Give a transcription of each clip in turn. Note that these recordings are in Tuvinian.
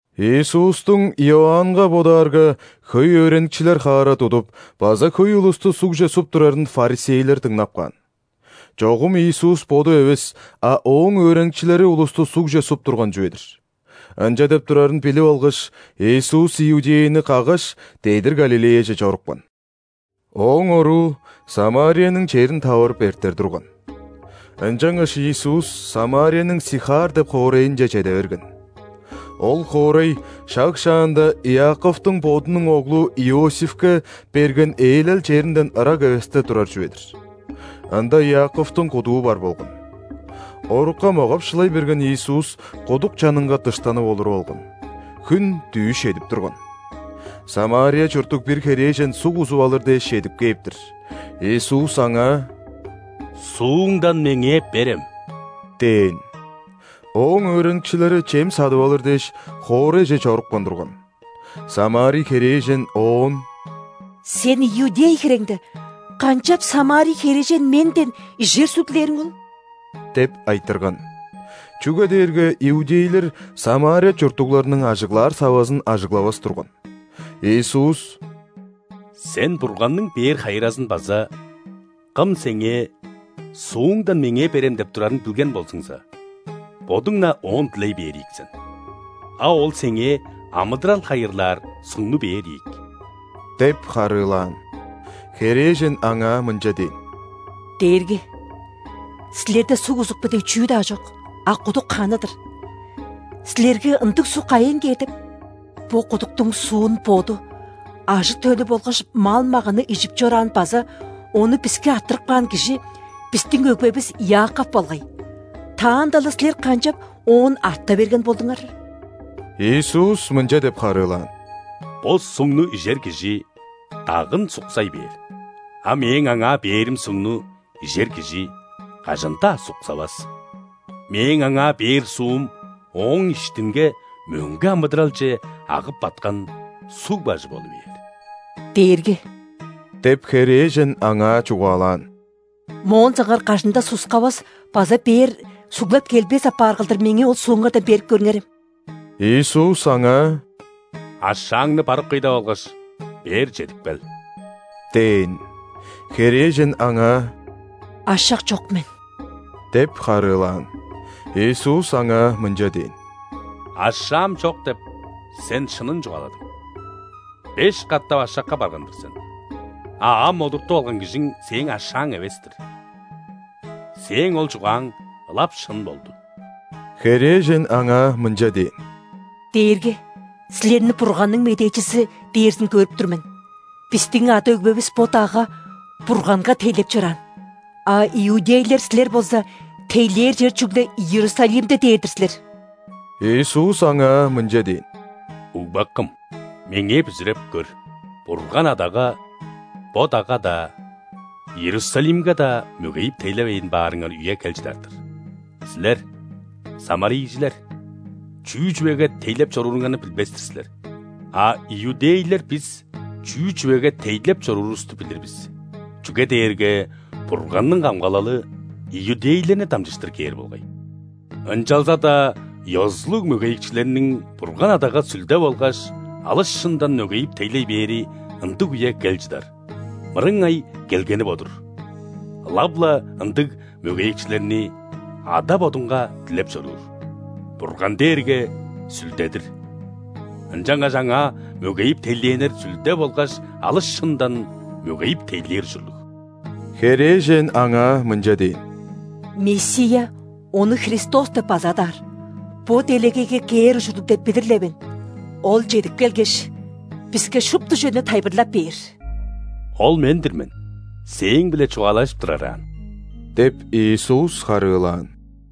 Иисустуң, Иоаннга бодаарга, хөй өөреникчилер хаара тудуп база хөй улусту ·сугже суп турарын ·фарисейлер дыңнап каан. (Чогум Иисус Боду эвес, а Ооң өөреникчилери улусту сугже суп турган чүве-дир.) Ынча деп турарын билип алгаш, Иисус Иудеяны каггаш, дедир Галилеяже чорупкан. Ооң оруу Самарияның черин таварып эртер турган. Ынчангаш Иисус Самарияның Сихар деп хоорайынче чеде берген. Ол хоорай шаг шаанда Иаковтуң бодунуң оглу Иосифке берген ээлел черинден ырак эвесте турар чүве-дир. Ында Иаковтуң кудуу бар болган. Орукка могап-шылай берген Иисус кудук чанынга дыштанып олуруп алган. Хүн дүъш чедип турган. ·Самария чурттуг бир херээжен суг узуп алыр дээш чедип кээп-тир. Иисус аңаа: «Сууңдан Меңээ берем» – дээн. Ооң өөреникчилери чем садып алыр дээш, хоорайже чорупкан турган. Самарий херээжен Оон: «Сен иудей хиреңде, канчап самарий херээжен менден ижер суг дилээриң ол?» – деп айтырган. (Чүге дээрге иудейлер Самария чурттугларның ажыглаар савазын ажыглавас турган.) Иисус: «Сен Бурганның бээр хайыразын база Кым сеңээ: „Сууңдан Меңээ берем“ – деп турарын билген болзуңза, бодуң-на Оон дилей бээр ийик сен, а Ол сеңээ амыдырал хайырлаар сугну бээр ийик» – деп харыылаан. Херээжен Аңаа мынча дээн: «Дээрги! Силерде суг узупку дег чүү-даа чок, а кудук ханы-дыр. Силерге ындыг суг кайыын кээр деп? Бо кудуктуң суун боду, ажы-төлү болгаш мал-маганы ижип чораан база ону биске арттырып каан кижи – бистиң өгбевис Иаков болгай. Таанда-ла Силер канчап оон арта берген болдуңар?» Иисус мынча деп харыылаан: «Бо сугну ижер кижи дагын суксай бээр. А Мээң аңаа бээрим сугну ижер кижи кажан-даа суксавас. Мээң аңаа бээр суум ооң иштинге мөңге амыдыралче агып баткан суг бажы болу бээр». «Дээрги – деп, херээжен Аңаа чугаалаан. – Моон соңгаар кажан-даа суксавас база бээр суглап келбес апаар кылдыр, меңээ ол сууңардан берип көрүңерем». Иисус аңаа: «Ашааңны барып кый деп алгаш, бээр чедип кел» – дээн. Херээжен Аңаа: «Ашак чок мен» – деп харыылаан. Иисус аңаа мынча дээн: «Ашаам чок деп, сен шынын чугааладың. Беш катап ашакка барган-дыр сен. А ам олуртуп алган кижиң сээң ашааң эвес-тир. Сээң ол чугааң ылап шын болду». Херээжен Аңаа мынча дээн: «Дээрги! Силерни Бурганның медээчизи дээрзин көрүп тур мен. Бистиң ада-өгбевис бо дагга. Бурганга тейлеп чораан, а иудейлер силер болза, тейлээр чер чүгле Иерусалимде дээр-дир силер». Иисус аңаа мынча дээн: «Угбакым, Меңээ бүзүреп көр, Бурган Адага бо дагга-даа, Иерусалимге-даа мөгейип тейлевейн баарыңар үе кел чыдар-дыр. Силер, самарийжилер, чүү чүвеге тейлеп чорууруңарны билбес-тир силер, а иудейлер бис чүү чүвеге тейлеп чоруурувусту билир бис, чүге дээрге Бурганның камгалалы иудейлерни дамчыштыр кээр болгай. Ынчалза-даа ёзулуг мөгейикчилерниң Бурган Адага сүлде болгаш алыс шындан мөгейип тейлей бээри ындыг үе кел чыдар, мырыңай келгени бо-дур. Ылап-ла ындыг мөгейикчилерни Ада Бодунга дилеп чоруур. Бурган дээрге Сүлде-дир. Ынчангаш Аңаа мөгейип тейлээннер сүлде болгаш алыс шындан мөгейип тейлээр ужурлуг». Херээжен Аңаа мынча дээн: «Мессия (Ону Христос деп база адаар) бо делегейге кээр ужурлуг деп билир-ле мен. Ол чедип келгеш, биске шупту чүвени тайылбырлап бээр». «Ол – Мен-дир мен, сээң-биле чугаалажып турар аан» – деп, Иисус харыылаан.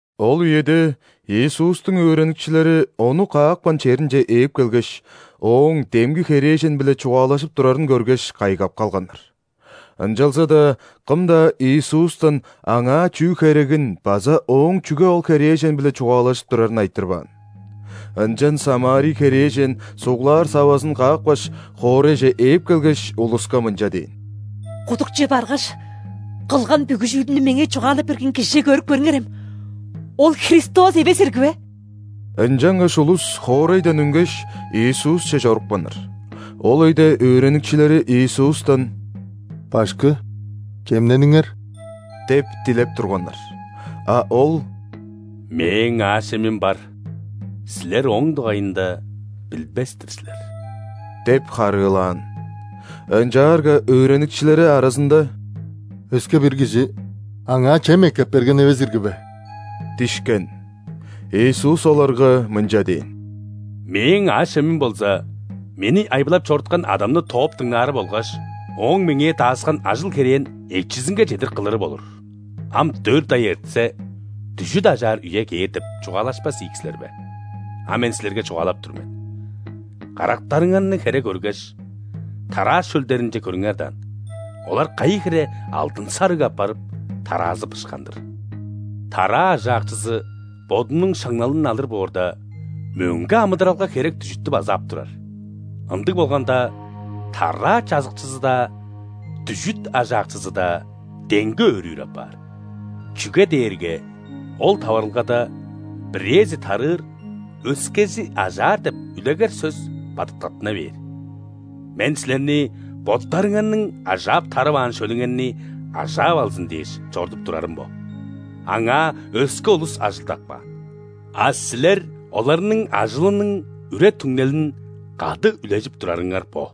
Ол үеде Иисустуң өөреникчилери Ону каапкан черинче ээп келгеш, Ооң демги херээжен-биле чугаалажып турарын көргеш, кайгап калганнар. Ынчалза-даа кым-даа Иисустан Аңаа чүү херегин база Ооң чүге ол херээжен-биле чугаалажып турарын айтырбаан. Ынчан самарий херээжен суглаар савазын каапкаш, хоорайже ээп келгеш, улуска мынча дээн: «Кудукче баргаш, кылган бүгү чүүлүмнү меңээ чугаалап берген Кижиже көрүп көрүңерем: Ол Христос эвес ирги бе?» Ынчангаш улус хоорайдан үнгеш, Иисусче чорупканнар. Ол өйде өөреникчилери Иисустан: «Башкы, чемнениңер!» – деп дилеп турганнар. А Ол: «Мээң аъш-чемим бар, силер ооң дугайында билбес-тир силер» – деп харыылаан. Ынчаарга өөреникчилери аразында: «Өске-бир кижи Аңаа чем эккеп берген эвес ирги бе?» – дишкен. Иисус оларга мынча дээн: «Мээң аъш-чемим болза Мени айбылап чоруткан Адамны тооп дыңнаары болгаш Ооң Меңээ дааскан ажыл-херээн эчизинге чедир кылыры болур. „Ам дөрт ай эртсе, дүжүт ажаар үе кээр“ – деп чугаалашпас ийик силер бе? А мен силерге чугаалап тур мен: карактарыңарны хере көргеш, тараа шөлдеринче көрүңер даан, олар кайы хире алдын-сарыг апарып, тараазы бышкан-дыр! Тараа ажаакчызы бодунуң шаңналын алыр боорда, мөңге амыдыралга херек дүжүттү база ап турар, ындыг болганда, тараа чажыкчызы-даа, дүжүт ажаакчызы-даа деңге өөрүүр апаар. Чүге дээрге ол таварылгада „Бирээзи тарыыр, өскези ажаар“ деп үлегер сөс бадыткаттына бээр. Мен силерни боттарыңарның ажаап-тарываан шөлүңерни ажаап алзын дээш чорудуп турарым бо – аңаа өске улус ажылдап каан, а силер оларның ажылының үре-түңнелин кады үлежип турарыңар бо».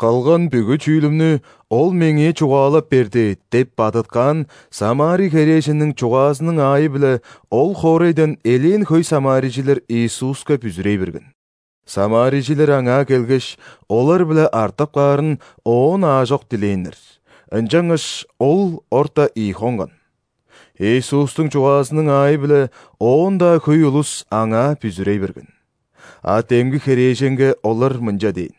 «Кылган бүгү чүүлүмнү Ол меңээ чугаалап берди» – деп бадыткаан самарий херээженниң чугаазының аайы-биле ол хоорайдан элээн хөй самарийжилер Иисуска бүзүрей берген. Самарийжилер Аңаа келгеш, олар-биле артып каарын Оон аажок дилээннер, ынчангаш Ол орта ийи хонган. Иисустуң чугаазының аайы-биле оон-даа хөй улус Аңаа бүзүрей берген. А демги херээженге олар мынча дээн: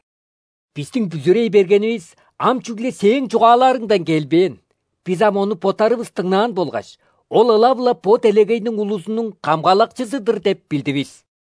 «Бистиң бүзүрей бергенивис ам чүгле сээң чугааларыңдан келбээн. Бис ам Ону боттарывыс дыңнаан болгаш, Ол ылап-ла бо делегейниң улузунуң Камгалакчызы-дыр деп билдивис».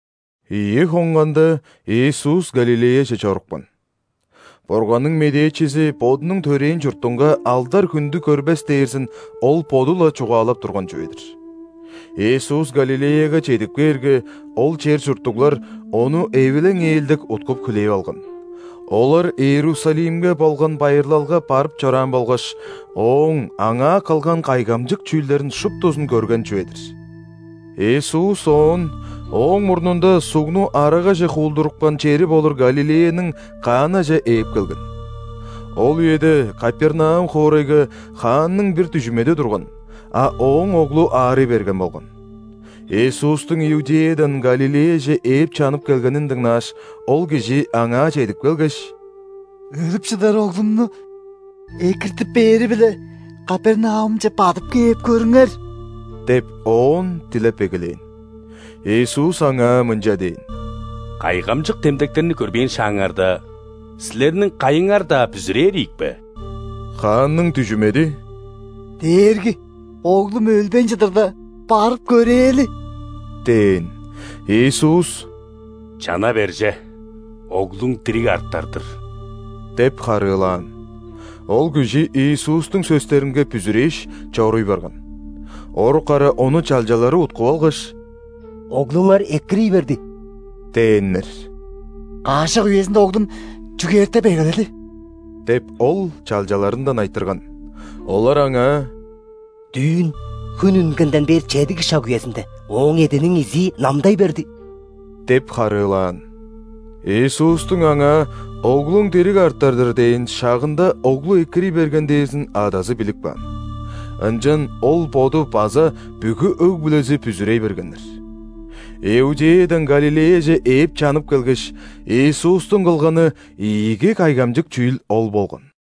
Ийи хонганда, Иисус Галилеяже чорупкан. Бурганның медээчизи бодунуң төрээн чуртунга алдар-хүндү көрбес дээрзин Ол Боду-ла чугаалап турган чүве-дир. Иисус Галилеяга чедип кээрге, ол чер чурттуглар Ону эвилең-ээлдек уткуп-хүлээп алган: олар Иерусалимге болган байырлалга барып чораан болгаш, Ооң аңаа кылган кайгамчык чүүлдерин шуптузун көрген чүве-дир. Иисус оон ооң мурнунда сугну арагаже хуулдурупкан чери болур Галилеяның Канаже ээп келген. Ол үеде Капернаум хоорайга хаанның бир дүжүмеди турган, а ооң оглу аарый берген болган. Иисустуң Иудеядан Галилеяже ээп чанып келгенин дыңнааш, ол кижи Аңаа чедип келгеш: «Өлүп чыдар оглумну экиртип бээри-биле Капернаумче бадып кээп көрүңер» – деп Оон дилеп эгелээн. Иисус аңаа мынча дээн: «Кайгамчык демдектерни көрбээн шааңарда, силерниң кайыңар-даа бүзүрээр ийик бе!» Хаанның дүжүмеди: «Дээрги! Оглум өлбейн чыдырда, барып көрээли!» – дээн. Иисус: «Чана бер че, оглуң дириг артар-дыр» – деп харыылаан. Ол кижи Иисустуң сөстеринге бүзүрээш, чоруй барган. Орук ара ону чалчалары уткуп алгаш: «Оглуңар экирий берди» – дээннер. «Каш шак үезинде оглум чүгээртеп эгеледи?» – деп, ол чалчаларындан айтырган. Олар аңаа: «Дүүн, хүн үнгенден бээр чедиги шак үезинде, ооң эъдиниң изии намдай берди» – деп харыылаан. Иисустуң аңаа: «Оглуң дириг артар-дыр» – дээн шагында оглу экирий берген дээрзин адазы билип каан. Ынчан ол боду база бүгү өг-бүлези бүзүрей бергеннер. Иудеядан Галилеяже ээп чанып келгеш, Иисустуң кылганы ийиги кайгамчык чүүл ол болган.